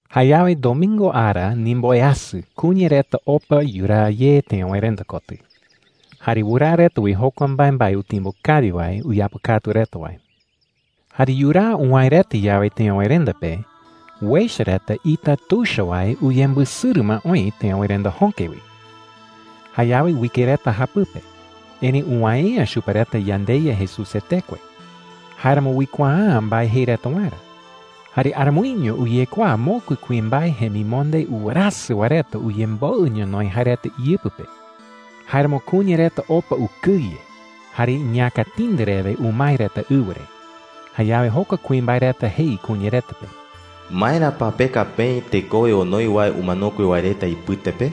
Jayawe domingo ara ndimboweasɨ kuña reta opa yuraa ye teöwerenda kotɨ. Jare wɨraa reta wi jokua mbaembae utimbo kawi wae uyapɨkatu reta wae. Jare yuraa uwäe reta yawe teöwerenda pe, uecha reta ita tuicha wae uyembɨsɨrɨ ma oï teöwerenda jöke wi. Jayawe uike reta japɨpe, erëi uwäe’ä chupe reta yandeYa Jesús jetekue. Jáeramo uikuaa’ä mbae jei reta waerä. Jare aramoiño uyekuaa mokui kuimbae jemimonde uwerasɨ wae reta uyemboɨ ñonoï jae reta iyɨpɨ pe. Jáeramo kuña reta opa ukɨye jare iñäkatindɨ rewe umae reta ɨwɨ re. Jayawe jokua kuimbae reta jei kuña reta pe: “¿Maera pa peka peï tekowe onoi wae umanokue wae reta ipɨte pe?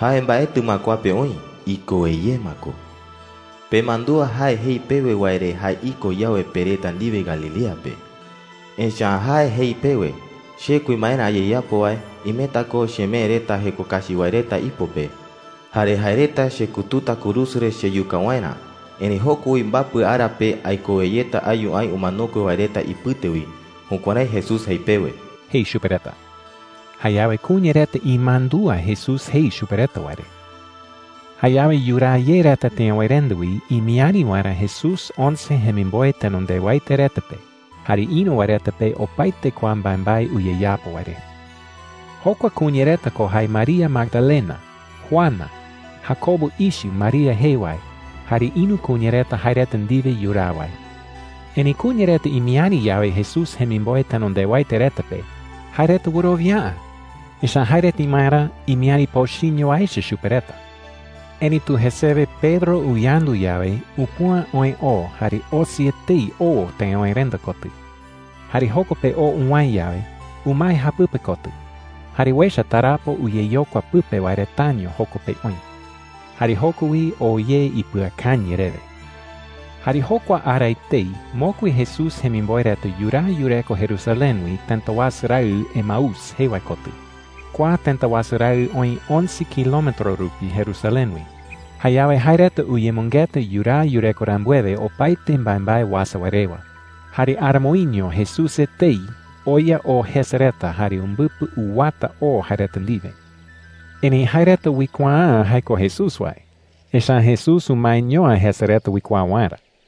Jae mbaetɨ ma kua pe oï. Ikowe ye ma ko,” jei chupe reta. “Pemandúa jae jei pewe wae re jae iko yawe pe reta ndiwe Galilea pe. Echa’ä jae jei pewe: ‘Che kuimbaerä ayeyapo wae, imeta ko chemee reta jeko kachi wae reta ipo pe. Jare jae reta chekututa kurusu re cheyuka waerä. Erëi joko wi mbapɨ ara pe aikowe yeta ayu aï umanokue wae reta ipɨte wi.’ Jukuärái Jesús jei pewe,” jei chupe reta. Jayawe kuña reta imandúa Jesús jei chupe reta wae re. Jayawe yuraa ye reta teöwerenda wi imiäri waerä Jesús once jemimboe tenondewaete reta pe jare ïru wae reta pe opaete kua mbaembae uyeyapo wae re. Jokua kuña reta ko jae María Magdalena, Juana, Jacobo ichɨ María jee wae, jare ïru kuña reta jae reta ndiwe yuraa wae. Erëi kuña reta imiäri yawe Jesús jemimboe tenondewaete reta pe, jae reta wɨrowia’ä. Echa’ä jae reta imaerä imiäri pochɨño wae echa chupe reta. Erëitu jesewe Pedro uyandu yawe, upüa oë oo, jare osi etei oo teöwerenda kotɨ. Jare joko pe oo uwäe yawe, umae japɨpe kotɨ. Jare uecha tarapo uyeyokua pɨpe wae retaño joko pe oï. Jayawe joko wi oo ye ipɨakañɨ rewe. Jare jokua ara etei mokui Jesús jemimboe reta yuraa yureko Jerusalén wi tëta wasu raɨ Emaús jee wae kotɨ. Kua tëta wasu raɨ oï once kilometro rupi Jerusalén wi. Jayawe jae reta uyemɨngeta yuraa yureko rambuewe opaete mbaembae uasa wae rewa. Jare aramoiño Jesús etei oya oo jese reta jare umbɨpɨ uwata oo jae reta ndiwe. Erëi jae reta uikuaa’ä jae ko Jesús wae, echa’ä Jesús umaeño’ä jese reta uikuaa waerä.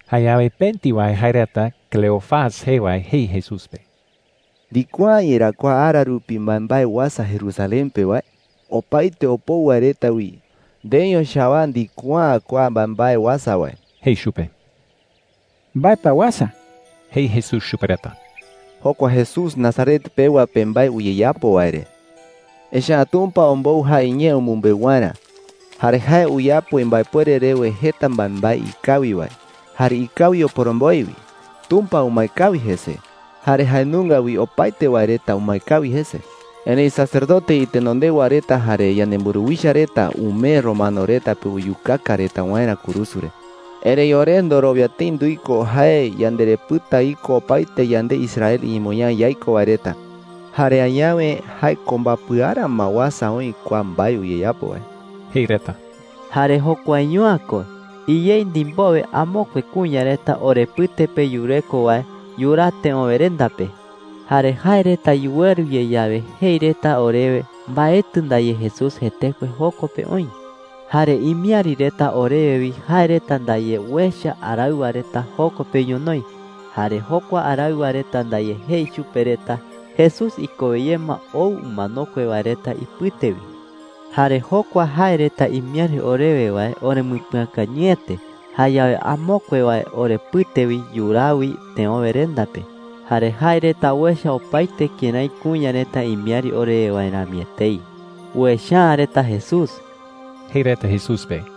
Jayawe pëti wae jae reta Cleofas jee wae jei Jesús pe: “¿Ndikuaa’ä yerá kua ara rupi mbaembae uasa Jerusalén pe wae? Opaete opou wae reta wi, ndeeño chawaa ndikuaa’ä kua mbaembae uasa wae,” jei chupe. “¿Mbae pa uasa?” jei Jesús chupe reta. “Jokua Jesús Nazaret pewa pe mbae uyeyapo wae re,” jei reta. “Echa’ä Tumpa ombou jae iñee umɨmbeu waerä. Jare jae uyapo imbaepuere rewe jeta mbaembae ikawi wae, jare ikawi oporomboe wi. Tumpa umae kawi jese, jare jae nunga wi opaete wae reta umae kawi jese,” jei reta. “Erëi sacerdote itenondewa reta jare yanemburuwicha reta umee romano reta pe uyukaka reta waerä kurusu re,” jei reta. “Erëi ore ndorowia tëi nduiko jae yanderepɨta iko opaete yande Israel iñemoñaa yaiko wae reta. Jare añawe jae ko mbapɨ ara ma uasa oï kua mbae uyeyapo wae,” jei reta. “Jare jokuaño’ä ko. Iyei ndimbowe amokue kuña reta orepɨte pe yureko wae yuraa teöwerenda pe. Jare jae reta yuweru ye yawe, jei reta orewe mbaetɨ ndaye Jesús jetekue joko pe oï,” jei reta. “Jare imiäri reta orewe wi jae reta ndaye uecha araɨwa reta joko pe ñonoï. Jare jokua araɨwa reta ndaye jei chupe reta Jesús ikowe ye ma ou umanokue wae reta ipɨte wi,” jei reta. “Jare jokua jae reta imiäri orewe wae orembɨpɨakañɨete. Jayawe amokue wae orepɨte wi yuraa wi teöwerenda pe. Jare jae reta uecha opaete kërái kuña reta imiäri orewe wae rami etei. Uecha’ä reta Jesús,” jei reta Jesús pe.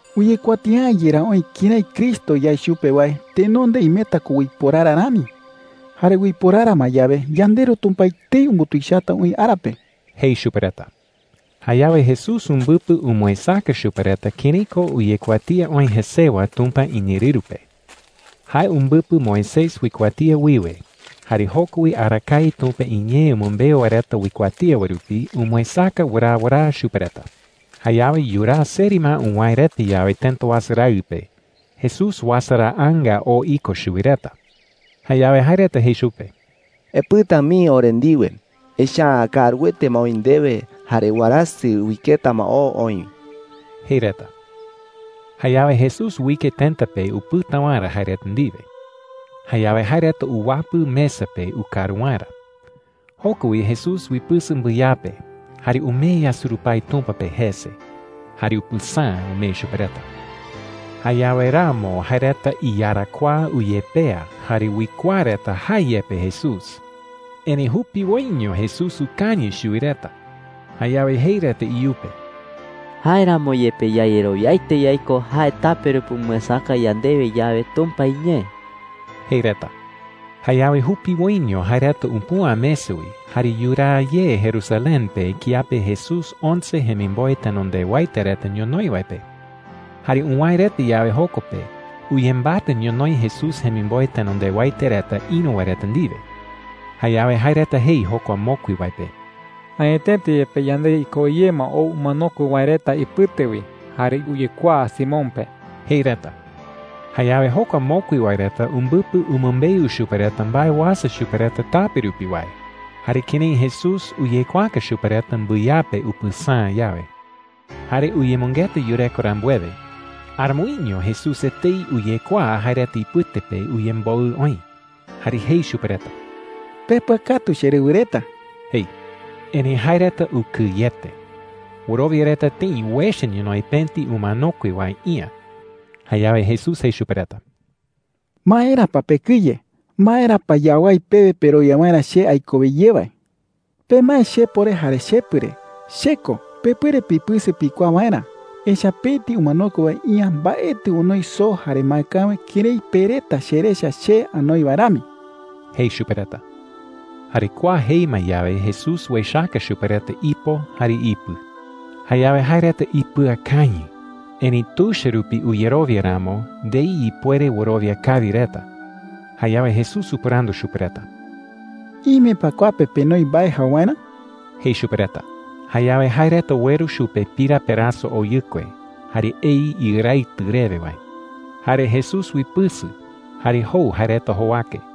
“¿Uyekuatia’ä yerá oï kërái Cristo yae chupe wae tenonde imeta ko uiporara rani? Jare uiporara ma yawe, yandeRu Tumpa etei umbutuichata oï ara pe,” jei chupe reta. Jayawe Jesús umbɨpɨ umɨesäka chupe reta kërái ko uyekuatía oï jesewa Tumpa iñeerɨru pe. Jae umbɨpɨ Moisés uikuatía wiwe, jare joko wi arakae Tumpa iñee umɨmbeu wae reta uikuatía wae rupi umɨesäka wɨraa wɨraa chupe reta. Jayawe yuraa seri ma uwäe reta yawe tëta wasu raɨ pe, Jesús uasaraanga oo iko chuwi reta. Jayawe jae reta jei chupe: “Epɨta mii ore ndiwe. Echa’ä kaaruete ma oï ndewe. Jare warasɨ uiketa ma oo oï,” jei reta. Jayawe Jesús uike tëta pe upɨta waerä jae reta ndiwe. Jayawe jae reta uwapɨ mesa pe ukaru waerä. Joko wi Jesús uipɨsɨ mbɨyape, jare umee yasurupái Tumpa pe jese, jare upɨsäa umee chupe reta. Jayawe ramo jae reta iyarakuaa uyepea jare uikuaa reta jae yepe Jesús. Erëi jupiwoiño Jesús ukañɨ chuwi reta. Jayawe jei reta iyupe: “Jáeramo yepe yayerowiaete yaiko jae tape rupi umɨesäka yandewe yawe Tumpa iñee,” jei reta. Jayawe jupiwoiño jae reta upüa mesa wi, jare yuraa ye Jerusalén pe kiape Jesús once jemimboe tenondewaete reta ñonoï wae pe. Jare uwäe reta yawe joko pe, uyembatɨ ñonoï Jesús jemimboe tenondewaete reta ïru wae reta ndiwe. Jayawe jae reta jei jokua mokui wae pe: “Añetete yepe yandeYa ikowe ye ma ou umanokue wae reta ipɨte wi, jare uyekuaa Simón pe,” jei reta. Jayawe jokua mokui wae reta umbɨpɨ umɨmbeu chupe reta mbae uasa chupe reta tape rupi wae, jare kërái Jesús uyekuaaka chupe reta mbɨyape upɨsäa yawe. Jare uyemɨngeta yureko rambuewe, aramoiño Jesús etei uyekuaa jae reta ipɨte pe uyemboɨ oï. Jare jei chupe reta: “Pepɨakatu, cherɨwɨ reta,” jei. Erëi jae reta ukɨyete. Wɨrowia reta tëi uecha ñonoï pëti umanokue wae iä. Jayawe Jesús jei chupe reta: “¿Maera pa pekɨye? ¿Maera pa yawái pewe perowia waerä che aikowe ye wae?” jei. “Pemae chepo re jare chepɨ re. Che ko. Pepuere pipɨsɨ pikuaa waerä. Echa’ä pëti umanokue wae iä mbaetɨ onoi soo jare maekäwe kërái pe reta cherecha che anoi wae rami,” jei chupe reta. Jare kua jei ma yawe, Jesús uechaka chupe reta ipo jare ipɨ. Jayawe jae reta ipɨakañɨ. Erëi tuicha rupi uyerowia ramo, ndei ipuere wɨrowia kawi reta. Jayawe Jesús upɨrandu chupe reta: “¿Ime pa kua pe penoi mbae jau waerä?” jei chupe reta. Jayawe jae reta ueru chupe pira peraso oyɨkue jare ei iɨraitɨ rewe wae. Jare Jesús uipɨsɨ jare jou jae reta jowake.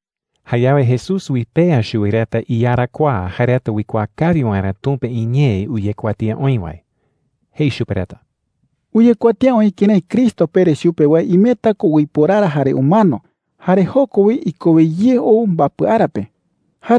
Jayawe Jesús uipea chuwi reta iyarakuaa jae reta uikuaa kawi waerä Tumpa iñee uyekuatía oï wae. Jei chupe reta: “Uyekuatía oï kërái Cristo pere chupe wae imeta ko uiporara jare umano, jare joko wi ikowe ye ou mbapɨ ara pe,” jei chupe reta.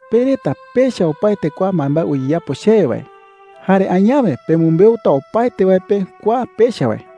“Pe reta pecha opaete kua mbaembae uyeyapo chewe wae. Jare añawe pemɨmbeuta opaete wae pe kua pecha wae.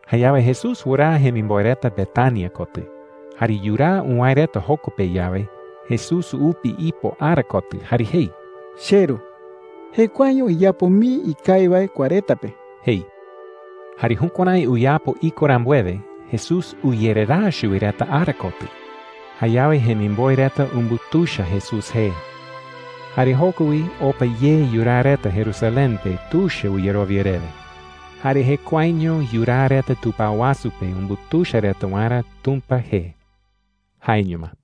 Jayawe Jesús wɨraa jemimboe reta Betania kotɨ. Jare yuraa uwäe reta joko pe yawe, Jesús upi ipo ara kotɨ jare jei: “CheRu, jekuaeño iyapo mii ikawi wae kua reta pe,” jei. Jare jukuärái uyapo iko rambuewe, Jesús uyereraa chuwi reta ara kotɨ. Jayawe jemimboe reta umbutuicha Jesús jee. Jare joko wi opa ye yuraa reta Jerusalén pe tuicha uyerowia rewe. Jare jekuaeño yuraa reta tupao wasu pe umbutuicha reta waerä Tumpa jee. Jaeño ma.